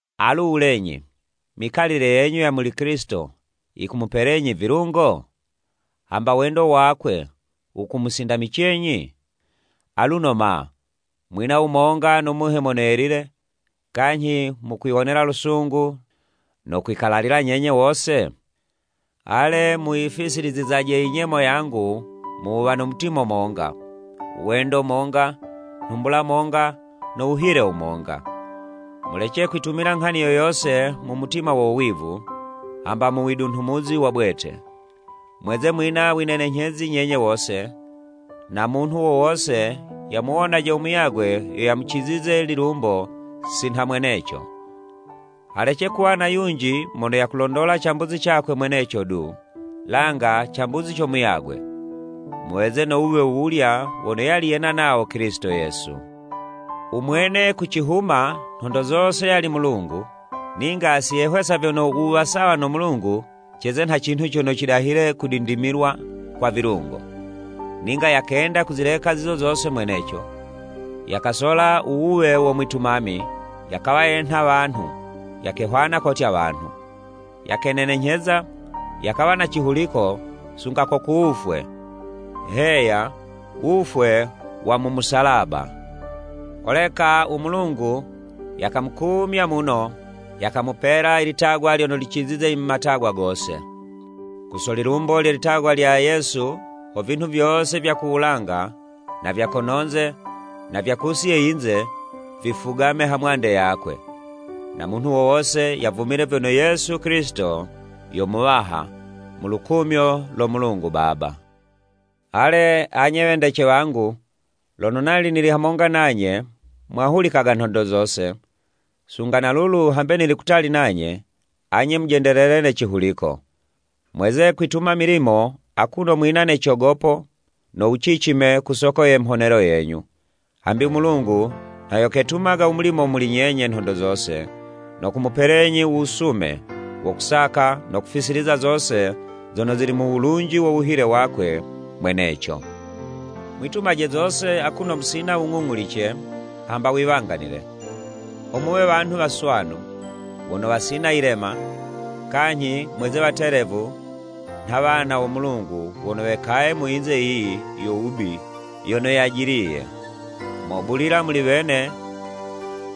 Alu wulenyi mikalile yenyu ya muli Kilisito, yikumupelenyi vilungo? Hamba wendo wakwe wukumusindamicenyi? Aluno ma, mwina wumonga no Muhe Mono Yelile, kanyhi mukwiwonela lusungu no kwikalalila nyenye wose? Ale muyifisilizizaje i nyemo yangu mu wuwa na mutima monga, wendo monga, nhumbula monga no wuhile wumonga. Mulece kwitumila nghani yo yose mu mutima wo wivu, hamba mu widunhumuzi wa bwete, mweze mwina winenenyhezi nyenye wose, na munhu wo wose yamuwonaje muyagwe yo yamucizize lilumbo sinha mweneco. Halece kuwa na yunji mono yakulondola cambuzi cakwe mweneco du, langa cambuzi co muyagwe. Muweze no wuwe wuwulya wono yali yena nawo Kilisito Yesu. U Mwene ku cihuma, nhondo zose yali Mulungu ninga si yehwesa vyono u wuwa sawa no Mulungu ceze nha cinhu cono cidahile kudindimilwa kwa vilungo. Ninga yakenda kuzileka zizo zose mweneco, yakasola u wuwe wo mwitumami, yakawa yenha wanhu yakehwana kotya wanhu. Yakenenenyheza, yakawa na cihuliko sunga ko ku wufwe, heya, wufwe wa mu musalaba. Holeka u Mulungu yakamukumya muno yakamupela i litagwa lyono licizize i matagwa gose. Ku so lilumbo lye litagwa lya Yesu ho vinhu vyose vya ku wulanga, na vya kono'nze na vya kusi ye yinze, vifugame hamwande yakwe, Na munhu wo wose yavumile vyono Yesu Kilisito yo Muwaha, mu lukumyo lo Mulungu Baba. Ale anye wendece wangu, lono nali nili hamonga nanye, mwahulikaga nhondo zose, sunga na lulu hambe nili kutali nanye, anye mujendelele ne cihuliko. Mweze kwituma milimo akuno mwina ne cogopo no wucicime ku soko ye mhonelo yenyu, hambi u Mulungu nha yo ketumaga u mulimo muli nyenye nhondo zose, no kumupelenyi u wusume wo kusaka no kufisiliza zose zono zili mu wulunji wo wuhile wakwe mweneco. Mwitumaje zose akuno musina wung'ung'ulice hamba wiwanganile, ho muwe wanhu waswanu, wono wasina yilema, kanyhi mweze watelevu nha wana wo Mulungu wono wekaye mu yinze yiyi yo wubi yono yajiliye. Mobulila muli wene,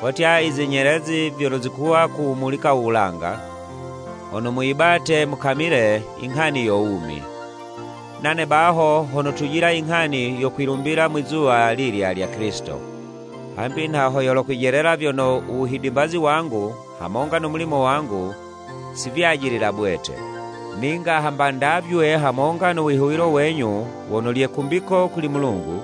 kotya i zinyelezi vyono zikuwa kuwumulika u wulanga, hono muyibate mukamile i nghani yo wumi. Nane baho ho notujila i nghani yo kwilumbila mwizuwa lilya lya Kilisito, hambi nha ho yolokwijelela vyono u wuhidimbazi wangu hamonga no mulimo wangu si vyajilila bwete. Ninga hamba ndavywe hamonga no wihuwilo wenyu wono lye kumbiko kuli Mulungu,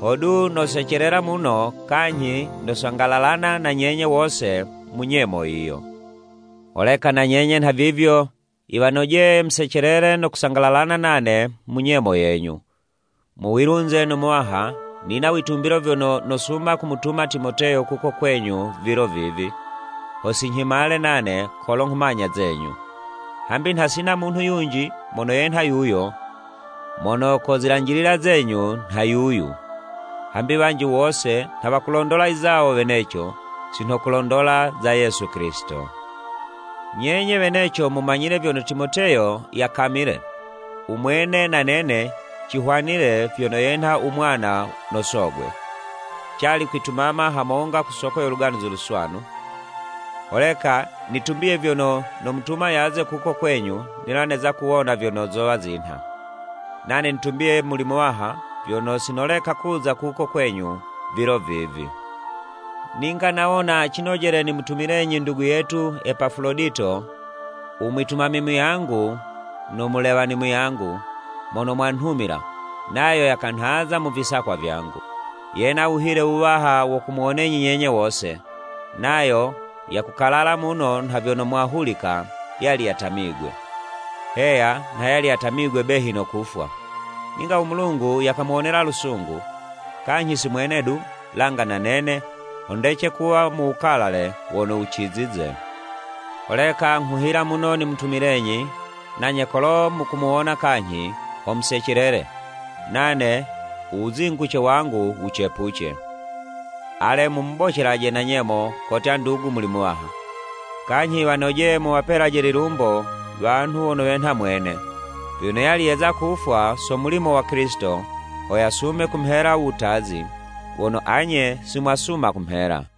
hodu nosecelela muno kanyhi nosangalalana na nyenye wose mu nyemo yiyo. Holeka na nyenye nhavivyo, yiwanojeye musecelele no kusangalalana nane mu nyemo yenyu. Mu wilunze no Muwaha, nina witumbilo vyono nosuma kumutuma Timoteyo kuko kwenyu vilo vivi, ho sinyhimale nane kolo nghumanya zenyu. Hambi nha sina munhu yunji mono yenha yuyo, mono kozilanjilila zenyu nha yuyu. Hambi wanji wose nha wakulondola i zawo weneco, si nho kulondola za Yesu Kilisito. Nyenye weneco mumanyile vyono Timoteyo yakamile, u mwene na nene, cihwanile vyono yenha u mwana no sogwe, cali kwitumama hamonga ku soko yo Luganuzi Luswanu. Holeka nitumbiye vyono nomutuma yaze kuko kwenyu nila neza kuwona vyono zowa zinha. Nane nitumbiye muli Muwaha vyono si noleka kuza kuko kwenyu vilo vivi. Ninga nawona cinojele nimutumilenyi ndugu yetu Epafulodito, u mwitumami muyangu no mulewani muyangu, mono mwanhumila, nayo yakanhaza mu visakwa vyangu. Yena wuhile wuwaha wo kumuwonenyi nyenye wose, nayo yakukalala muno nha vyono mwahulika yali yatamigwe. Heya nha yali yatamigwe behi no kufwa. Ninga u Mulungu yamuwonela lusungu, kanyhi si mwene du, langa na nene, ho ndece kuwa mu wukalale wono wucizize. Holeka nghuhila muno nimutumilenyi, nanye kolo mukumuwona kanyhi, ho musecelele, nane u wuzinguce wangu wucepuce. Ale mumubocelaje na nyemo kotya ndugu muli Muwaha. Kanyhi yiwanojeye muwapelaje lilumbo wanhu wono wenha mwene, vyono yali yeza kufwa so mulimo wa Kilisito, ho yasume kumhela u wutazi, wono anye si mwasuma kumhela.